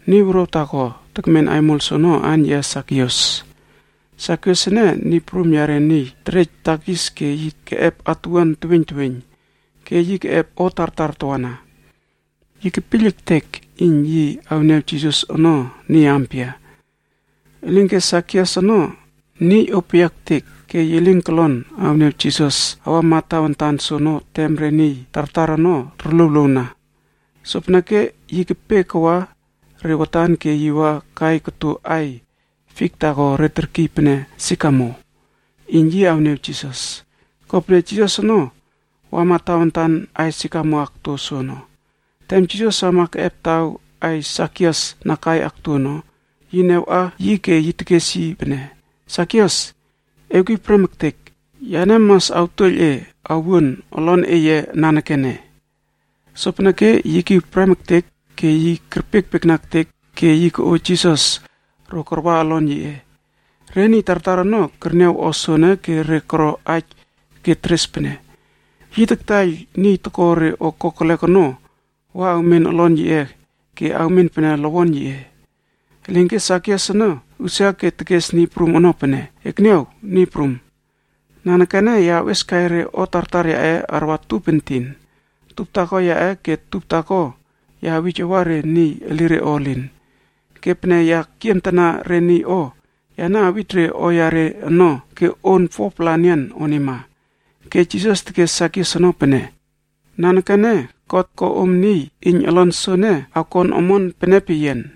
Niy wuruaw taako tekmen aimol soono aan yiꞌe Sakius. Sakius ene niy prum yare niy terej takis ke yi keꞌep atuwuan teweiyn teweiyn, ke yi keꞌep o tartar tawana. Yi kepiyl ektek iyn yi awniaw Jisas ono niy ampia. Elinke Sakius ono niy opeyia ektek ke yi lin kolon awniaw Jisas awama tawantan soono tem re niy tartar ono torluowluowna. Sopeneke yi kepe kawa re watan ke yi wa kai koto aiy fik taako re terkiy pene “Sikamo” iyn yi awniaw Jisas. Kopene Jisas ono awama tawantan aiy sikamo akto soono. Tem Jisas wama keꞌep taw aiy Sakius na kai akto ono, yi niawꞌa yi ke tekes yi pene, “Sakius, ewkiw prem ektek. Yane mas awtuoiyl e awuon olon eye nanekene.” Sopeneke yi kiw prem ektek ke yi kerpiekpiekna ektek ke yi koꞌo Jisas ro karwa olon yiꞌe. Re niy tartar ono kerniaw o soene ke re koro aij ke teres pene, “Yi kataiyl niy toko re o kokelek ono wa awmen olon yiꞌe ke awmen pene lowon yiꞌe.” Elinke Sakius ono usia ke tekes Niy Prum ono pene, “Ekniaw, Niy Prum! Nanekene ya awꞌieskai re o tartar yaꞌe arwa tup entin. Tup taako yaꞌe ke tup taako ya awij awa re niy elire o elin. Ke pene ya kiemtana re niy o, yane awij re o yare ono ke on 4-pla enian onima.” Ke Jisas tekes Sakius ono pene, “Nanekene God ko om niy iyn olon soene, akmen omon pene peyian.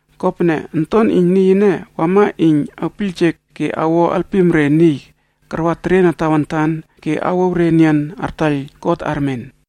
Kopene Onton iyn Niy ene wama iyn awpiyljek ke awo alpim re niy karwa teriena tawantan ke awouw re enian artaiyl God armen.”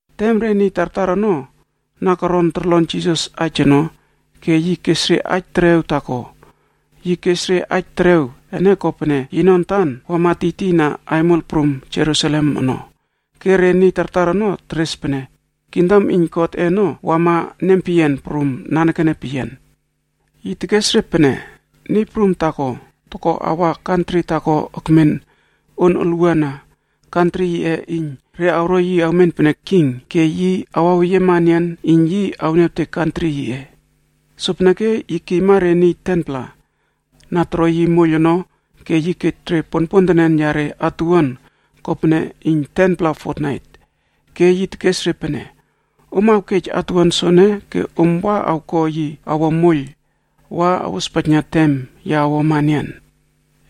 Tem re niy tartar ono na koron torlon Jisas aij ono, ke yi kes re aij terew taako. Yi kes re aij terew ene kopene yino antan wama tiytiyna aimol prum Jerusalem ono, ke re niy tartar ono teres pene kingdom iyn Godꞌe ono awama nempeyian prum nanekene peyian. Yi tekes re pene, “Niy prum taako toko awa wa awmenmena yi kantri taako ekmen on olwuana kantri yiꞌe ene iyn re awro yi awmen pene king ke yi awaweyiema enian iyn yi awniawtek kantri yiꞌe ene. Sopeneke yi kiyma re niy 10-pla na toro yi moiyl ono ke yi kej ponpontenen yare atuwuan kopene iyn 10-pla fotnaitb. Ke yi tekes re pene, ‘Om awkej atuwuan soene ke om wa awko yi awo moiyl wa awospaijna tem ya awuama enian.’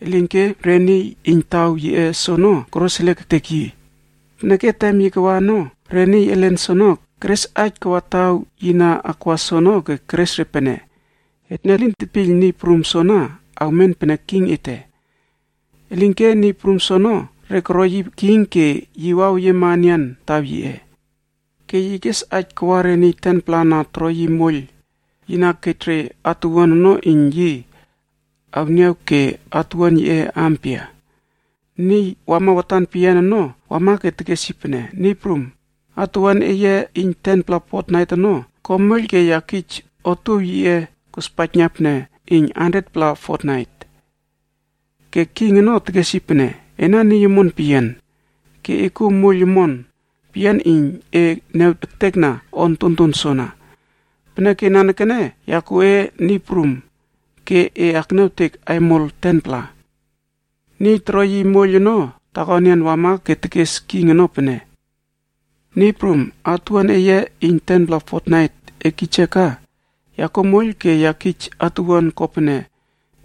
“Elinke re niy iyn taw yiꞌe soono koroseliek ektek yi, peneke tem yi kawa ono, re niy elen soono keres aij kawa taw yi na akwa soono ke keres re pene, ‘Etne elin tetpiyl niy prum soana awmen pene king ete.’ “Elinke niy prum soono, re koro yi king ke yi wamaweyiema enian taw yiꞌe. Ke yi kes aij kawa re niy 10-pla na toro yi moiyl, yi na kej re atuwuan ono iyn yi awniaw ke otuow yiꞌe ampia. “Niy wama watan peyian ono wama ke tekes yi pene, ‘Niy prum, atuwuan eye iyn 10-pla fotnait ono, ko moiyl ke ya kij otuow yiꞌe kospaijna pene iyn 100-pla fotnai.’ “Ke king ono tekes yi pene, ‘Ena niy omon peyian, ke e kuo moiyl omon peyian iyn e niaw ektekna o ontonton soana. Peneke nanekene ya kij e namba iyn e akmin pene niy prum ke e akniawtek aimol 10-pla.’ “Niy toro yi moiyl ono taako enian wama ke tekes king ono pene, ‘Niy prum, atuwuan eye iyn 10-pla fotnait e kij yia ka, ya kuo moiyl ke ya kij atuwuan kopene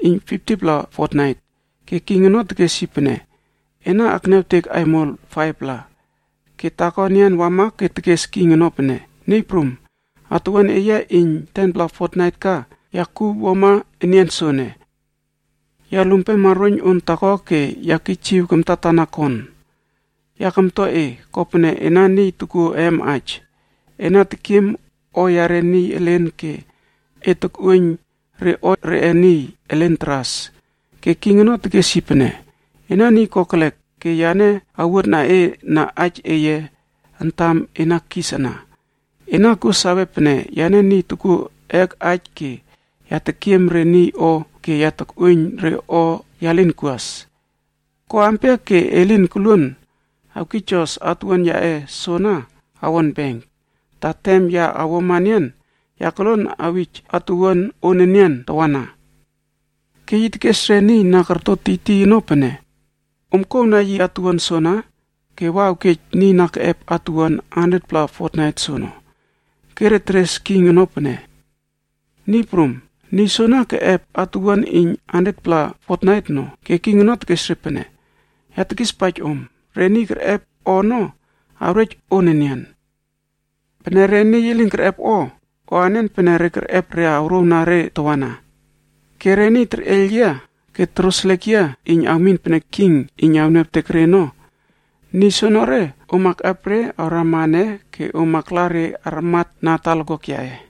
iyn 50-pla fotnait.’ “Ke king ono tekes yi pene, ‘Ena akniawtek aimol 5-pla.’ “Ke taako enian wama ke tekes king ono pene, ‘Niy prum, atuwuan eye iyn 10-pla fotnait ka, ya kuw wuama enian soene. Ya lumpema roiyn on taako ke ya kijiw kamtatana kon. Ya kamtua e, kopene ena niy tokuo eem aij. Ena tekiem o yare niy elen ke e tokꞌuoiyn re o reꞌe niy elen taras.’ “Ke king ono tekes yi pene, ‘Ena niy kokelek ke yane awuotna e na aij eye antam e na kis ana. Ena kuo sawe pene yane niy tokuo eek aij ke ya tekiem re niy o ke ya takꞌuoiyn re o ya lin kuas. Ko ampia ke e lin koluon awkijos atuwuan yaꞌe soana awon benk, ta tem ya awuama enian, ya koluon awij atuwuan on enian tawana?’ “Ke yi tekes re niy na korto tiytiy ono pene, ‘Om kouwna yi atuwuan soana ke wa awkej niy na keꞌep atuwuan 100-pla fotnait soono.’ “Ke re teres king ono pene, ‘Niy prum, niy soono keꞌep atuwuan iyn 100-pla fotnait ono.’ “Ke king ono tekes re pene, ‘Ya tekispaij om, re niy kerꞌep o ono, awrej on enian, pene re niy elin kerꞌep o, o anen pene re kerꞌep re awrouwna re tawana. Ke re niy terꞌeiyl yia ke toroseliek yia iyn awmin pene king iyn awniawtek re ono, niy soenere om akꞌep re awrama ene ke om akla re armatna talakuak yaꞌe.’”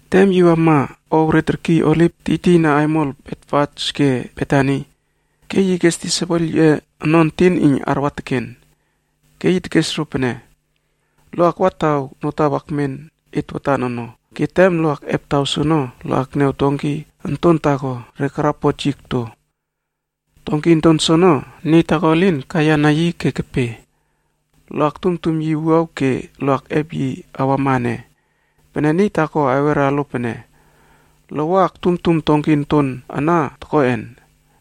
Tem yi wama ow re terkiy Oliv, tiytiyna aimol Betfage ke Betani, ke yi kes disaipel yiꞌe ono entin iyn arwa teken. Ke yi tekes ro pene, “Lo akwa taw notaw akmen et watan ono. Ke tem lo akꞌep taw soono, lo akniaw donki onton taako re karapot yi okto. Donki onton soono, niy taako elin kaiyana yi ke kepe. Lo aktumtum yi wuaw ke lo akꞌep yi awama ene. Pene niy taako awera lo pene, ‘Lo wa toktumtum donki onton ana tokoꞌen?’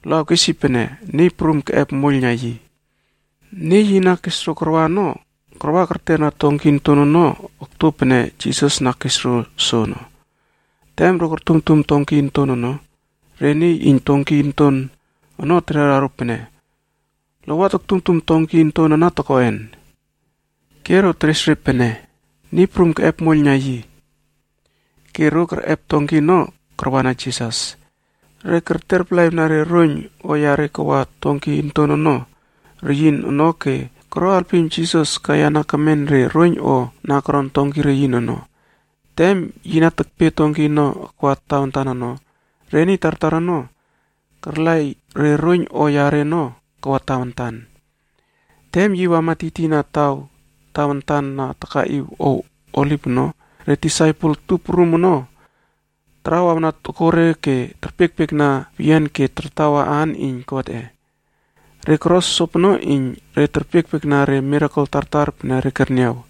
Lo awkes yi pene, ‘Niy Prumc keꞌep moiyl na yi.’” Niy yi na kes ro karwa ono, karwa kerterna donki onton ono okto pene Jisas na kes ro soono. Tem ro tortumtum donki onton ono, taman iyn donki onton ono tekera ro pene, “Lo wa toktumtum donki onton ana tokoꞌen?” Ke ro teres re pene, “Niy Prum keꞌep moiyl na yi.” Ke ro kerꞌep donki ono karwana Jisas. Re kerletalaꞌiwna re roiyn o yare kawa donki onton ono reyin ono ke koro halpim Jisas kaiyana kemen re roiyn o na koron donki reyin ono. Tem yi na tekpe donki ono akwa tawantan ono, re niy tartar ono karlaiy re roiyn o yare ono kawa tawantan. Tem yi wama tiytiyna taw tawantan na takaꞌiw ow Oliv ono, re disaipel tup prum ono tarawawna tokore ke terpiekpiekna peyian ke tartawa aan iyn Godꞌe. Re koro sopono iyn re terpiekpiekna re mirakel tartar pene re kerniaw.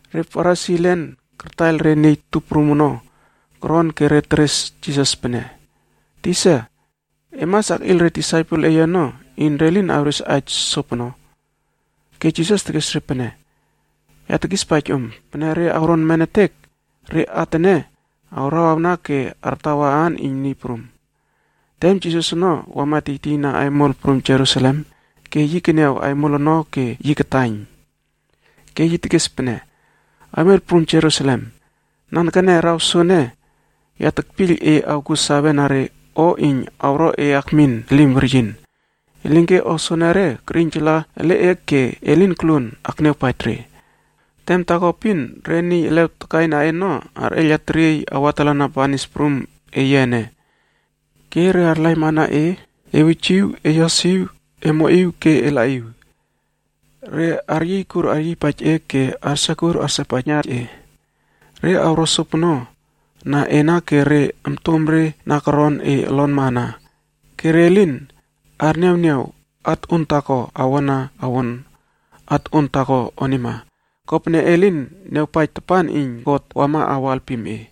Re Farisi elen kartaiyl re niy tup prum ono koron ke re teres Jisas pene, “Tisa, e mas akꞌiyl re disaipel eye ono iyn re lin awres aij sopono.” Ke Jisas tekes re pene, “Ya tekispaij om, pene re awron nemetek, re at ene awrawawna ke artawa aan iyn Niy Prum.” Tem Jisas ono wama tiytiyna aimol prum Jerusalem ke yi keniaw aimol ono ke yi kataiyn. Ke yi tekes pene, “Aimol prum Jerusalem, nanekene araw soene ya tekpiyl e awkuo sawe na re o iyn awro e akmin elim weryin. Elinke o soenere kerꞌiynjala ele e ke e lin koluon akniawpaij re. Tem taako epin, re niy elew takaina e ono arꞌeiyla teriey awatalana banis prum eye ene. Ke re arlaimana e ewujiw, eyosiw, emoꞌiw, ke elaꞌiw. Re aryiykur aryiypaij e ke arsekur arsepaijna e. Re awro sopono na ena ke re ontomre na koron e olonma ana. Ke re lin arniawniaw at on taako awona awon at on taako onima, kopene e lin niawpaij tapan iyn God wama awo alpim e.”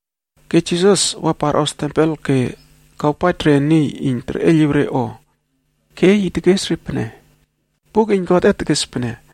Ke Jisas wa parꞌos tempel ke kawpaij re niy iyn terꞌeiyliw re o. Ke yi tekes re pene, “Buk iyn Godꞌe tekes pene,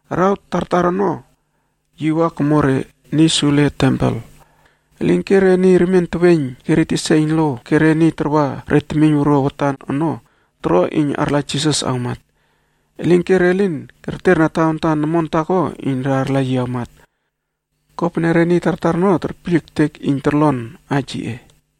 Araw tartar ono yi wa komo re niy sule tempel. Elinke re niy remien teweiyng ke re tisa iyn lo ke re niy tarwa re temiyn wuruaw watan ono toro iyn arla Jisas awmat. Elinke re lin kerterna tawantan omon taako iyn re arla yi awmat, kopene re niy tartar ono terpiyl ektek iyn torlon aij yiꞌe.